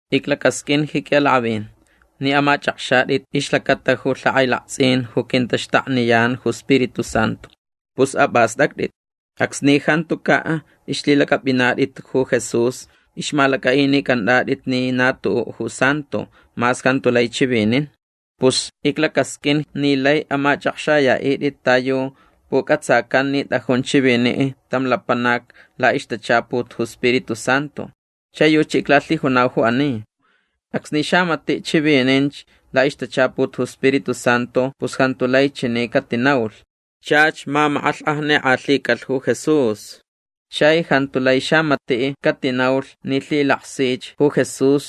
Iclacasq'uin ji qui'alak'avin ni amach'akxat'it ixlacata ju lhak'ailakts'in ju quintaxtakniyan ju Spiritu Santu. Pus ap'ast'act'it. Acsni jantuca' ixlhilac'ap'inat'it ju Jesús ixmalac'a'inic'ant'at'it ni na tu'u' ju santo mas jantu lai chivinin. Pus iclacasq'uin ni lai amach'akxaya'it'it ta yu puc'atsacan ni t'ajun chivini' tam lapanac la'ixtachaput ju Spiritu Santu. Chai yuchi iclalhijunau ju ani. Acsni xamati' chivininch la'ixtachaput ju Spiritu Santu pus jantu lai chani catinaulh: “Chach mamak'alhk'ajnik'alhicalh ju Jesús”. Chai jantu lai xamati' catinaulh ni lhilaksich ju Jesús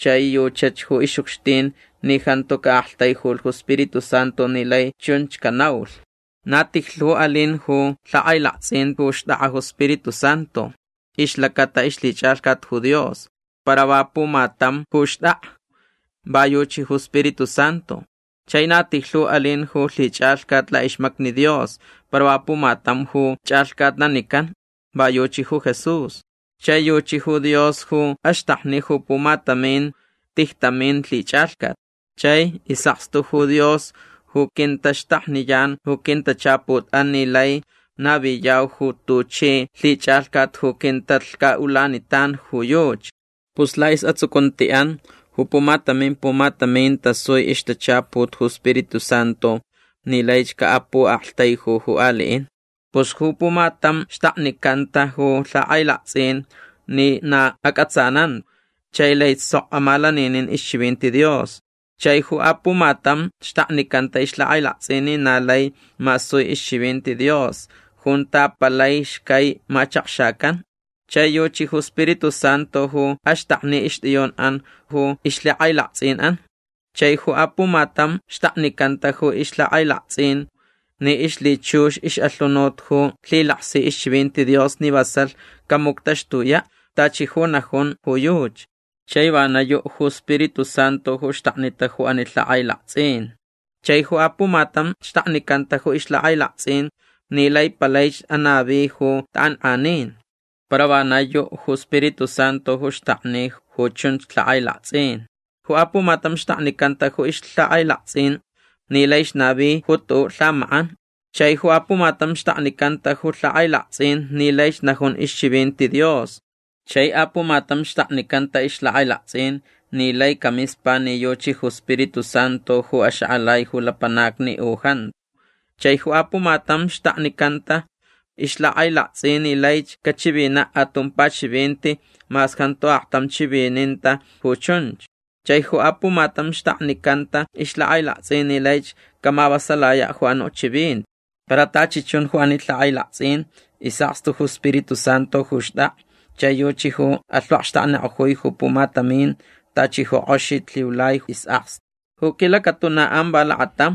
chai yuchach ju ix'ucxtin ni jantu ca'aktaijulh ju Spiritu Santu ni lai chunch canaulh. Na tijlhu alin ju lhak'ailakts'in ju xt'ak'a ju Spiritu Santu ixlacata ixlhich'alhcat ju Dios. Para va pumatam ju xt'ak'a. Va yuchi ju Spiritu Santu. Chai na tijlhu alin ju lhich'alhcat la'ixmacni Dios para va pumatam ju ch'alhcatnanican. Va yuchi ju Jesús. Chai yuchi ju Dios ju axtakni ju pumatamin tijtamin lhich'alhcat. Chai is'akstu ju Dios ju quintaxtakniyan ju quintachaput'an ni lai naviyau ju tuchi lhich'alhcat ju quintalhca'ulanitan ju yuchi. Pus la'is'atsucunti'an ju pumatamin pumatamin tasui ixtachaput ju Spiritu Santu ni laich ca'apu'aktaiju ju ali'in. Pus ju pumatam xtaknicanta ju lhak'ailakts'in ni na ac'atsananta chai laich sok amalaninin ixchivinti Dios. Chai ju apumatam xtaknicanta ixlhak'ailakts'in ni na lai masui ixchivinti Dios junta palai xcai machakxacan. Chai yuchi ju Spiritu Santu ju axtakni ixt'iyun'an ju ixlhak'ailakts'in'an. Chai ju apumatam xtaknicanta ju ixlhak'ailakts'in ni ixlhichux ix'alhunut ju lhilaksi ixchivinti Dios ni vasalh camuctaxtuya' tachi ju najun ju yuchi. Chai vana yu' ju Spiritu Santu ju xtaknita ju ani lhak'ailakts'in. Chai ju apumatam xtaknicanta ju ixlhak'ailakts'in ni lai palaich anavi ju tak'ank'anin. Para vana yu' ju Spiritu Santu ju xtakni ju chunch lhak'ailakts'in. Ju apumatam xtaknicanta ju ixlhak'ailakts'in ni laich navi ju tu'u' lhamak'an. Chai ju apumatam xtaknicanta ju lhak'ailakts'in ni laich najun ixchivinti Dios. Chai apumatam xtaknicanta ixlhak'ailakts'in ni lai camispa ni yuchi ju Spiritu Santu ju axak'alai ju lapanacni u jantu. Chai ju apumatam xtaknicanta ixlhak'ailakts'in ni laich cachivina' atumpa chivinti mas jantu aktam chivininta ju chunch. Chai ju apumatam xtaknicanta ixlhak'ailakts'in ni laich camavasalaya' ju anu' chivinti. Para tachi chun ju ani lhak'ailakts'in is'akstu ju Spiritu Santu ju xt'ak'a chai yuchi ju alhvakxtaknik'ojui ju pumatamin tachi ju k'oxich lhiulai is'akstu. Ju quilacatuna'an va lakatam.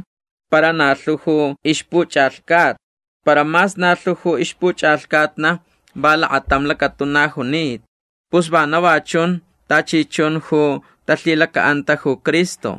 Para na lhu ju ixpuch'alhcatna. Para mas na lhu ju ixpuch'alhcatna va lakatamch lacatuna junita. Pus vana va chun tachi chun ju talhilaca'anta ju Cristo.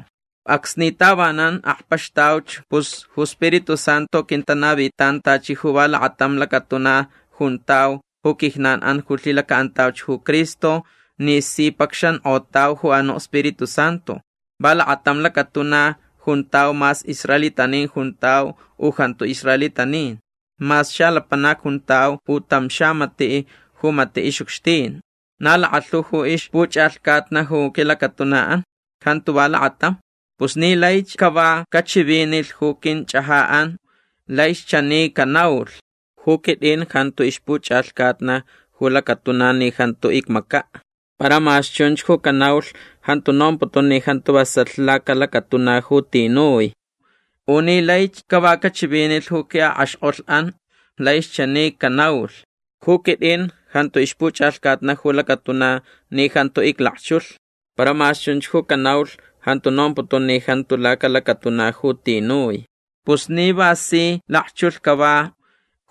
Acsni tavanan akpaxtauch pus ju Spiritu Santu quintanavinitan tachi ju va lakatam lacatuna juntau ju quijnan'an ju lhilaca'antauch ju Cristo ni si pacxank'otauch ju anu' Spiritu Santu. Va lakatam lacatuna juntau mas israelitanin juntau u jantu israelitanin. Mas xalapanac juntau u tam xamati' ju mati' ix'ucxtin. Na lakalhu ju ixpuch'alhcatna ju quilacatuna'an. Jantu va lakatam. Pus ni laich cava cachivinilh ju quinch'aja'an laich chani canaulh: “Ju quit'in jantu ixpuch'alhcatna ju lacatuna ni jantu icmaca'”. Para mas chunch ju canaulh jantu nomputun ni jantu vasalh lacalacatuna ju tinui. U ni laich cava cachivinilh ju qui'ak'axk'olh'an laich chani canaulh: “Ju quit'in jantu ixpuch'alhcatna ju lacatuna ni jantu iclakchulh”. Para mas chunch ju canaulh jantu nomputun ni jantu lacalacatuna ju tinui. Pus ni va si lakchulh cava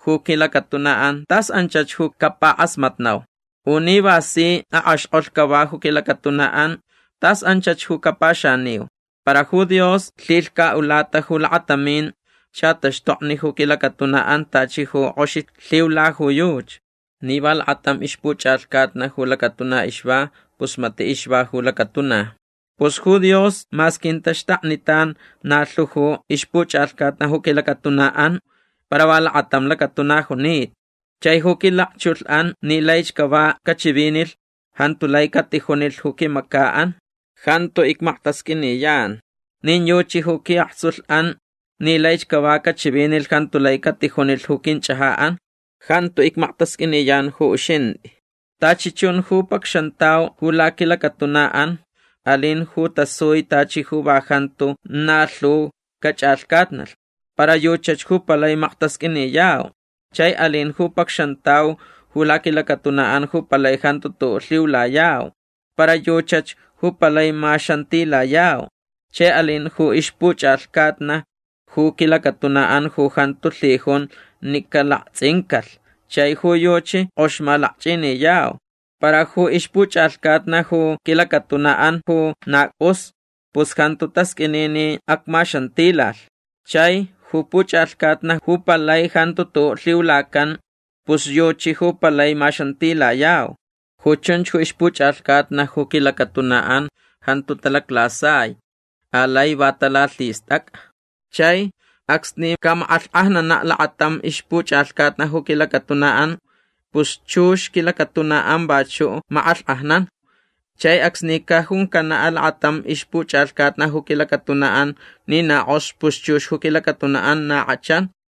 ju quilacatuna'an tas anchach ju capak'asmatnau. U ni va si ak'axk'olh cava ju quilacatuna'an tas anchach ju capaxaniu. Para ju Dios lhilhca'ulata ju lakatamin xataxtokni ju quilacatuna'an tachi ju k'oxich lhiula ju yuchi. Ni va lakatam ixpuch'alhcatna ju lacatuna ixva pus mati' ixva ju lacatuna. Pus ju Dios mas quintaxtaknitan na lhu ju ixpuch'alhcatna ju quilacatuna'an para va lakatam lacatuna junita. Chai ju quilakchulh'an ni laich cava cachivinilh jantu lai catijunilh ju quimaca'an: “Jantu icmaktasq'uiniyan”. Nin yuchi ju qui'aktsulh'an ni laich cava cachivinilh jantu lai catijunilh ju quinch'aja'an: “Jantu icmaktasq'uiniyan ju uxint'i”. Tachi chun ju pacxantau ju laquilacatuna'an alin ju tasui tachi ju va jantu na lhu cach'alhcatnalh. Para yuchach ju palai maktasq'uiniyau. Chai alin ju pacxantau ju laquilacatuna'an ju palai jantu tu'u' lhiulayau. Para yuchach ju palai maxantilayau. Chai alin ju ixpuch'alhcatna ju quilacatuna'an ju jantu lhijun ni calakts'incalh chai ju yuchi k'ox malakch'iniyau. Para ju ixpuch'alhcatna ju quilacatuna'an ju na c'us pus jantu tasq'uini ni acmaxantilalh. Chai ju puch'alhcatna ju palai jantu tu'u' lhiulacan pus yuchi ju palai maxantilayau. Ju chunch ju ixpuch'alhcatna ju quilacatuna'an jantu talaclasai. Alai va talalhist'ac'a. Chai acsni camak'alhk'ajnana' lakatam ixpuch'alhcatna ju quilacatuna'an pus chux quilacatuna'an vachu' mak'alhk'ajnan. Chai acsni cajuncana' lakatam ixpuch'alhcatna ju quilacatuna'an ni na k'ox pus chux ju quilacatuna'an na k'achan.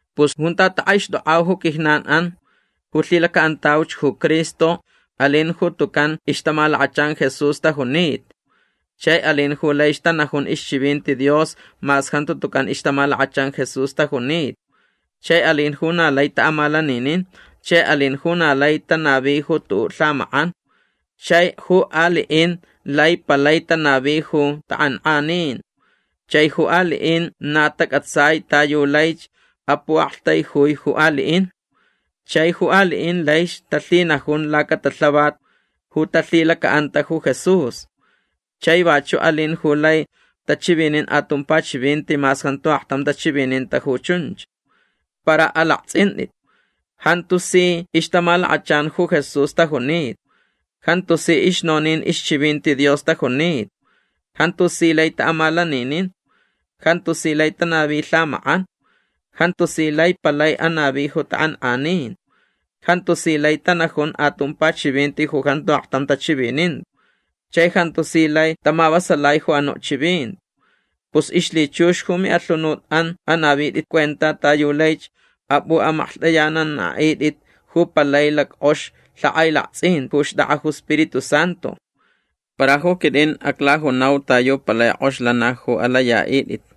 Pus junta tak'aixt'ok'au ju quijnan'an ju lhilaca'antauch ju Cristo alin ju tucan ixtamalakachan Jesús tajunita. Chai alin ju laich tanajun ixchivinti Dios mas jantu tucan ixtamalakachan Jesús tajunita. Chai alin ju na lai ta'amalaninin. Chai alin ju na lai tanavi ju tu'u' lhamak'an. Chai ju ali'in lai palai tanavi ju tak'ank'anin. Chai ju ali'in na tac'atsai ta yu laich apu'aktaijui ju ali'in. Chai ju ali'in laich talhinajun lacatalhavat ju talhilaca'anta ju Jesús. Chai vachu' alin ju lai tachivinin atumpa chivinti mas jantu aktam tachivininta ju chunch. Para alakts'int'it. Jantu si ixtamalakachan ju Jesús tajunita. Jantu si ixnonin ixchivinti Dios tajunita. Jantu si lai ta'amalaninin. Jantu si lai tanavi lhamak'an. Jantu si lai palai anavi ju tak'ank'anin. Jantu si lai tanajun atumpa chivinti ju jantu aktam tachivininta. Chai jantu si lai tamavasalai ju anu' chivinti. Pus ixlhichux ju mi'alhunut'an anavit'it cuenta ta yu laich ap'u'amaklht'ayanana'it'it ju palai lack'ox lhak'ailakts'in ju xt'ak'a ju Spiritu Santu. Para ju quit'in aclajunau ta yu palai k'ox lana ju alaya'it'it.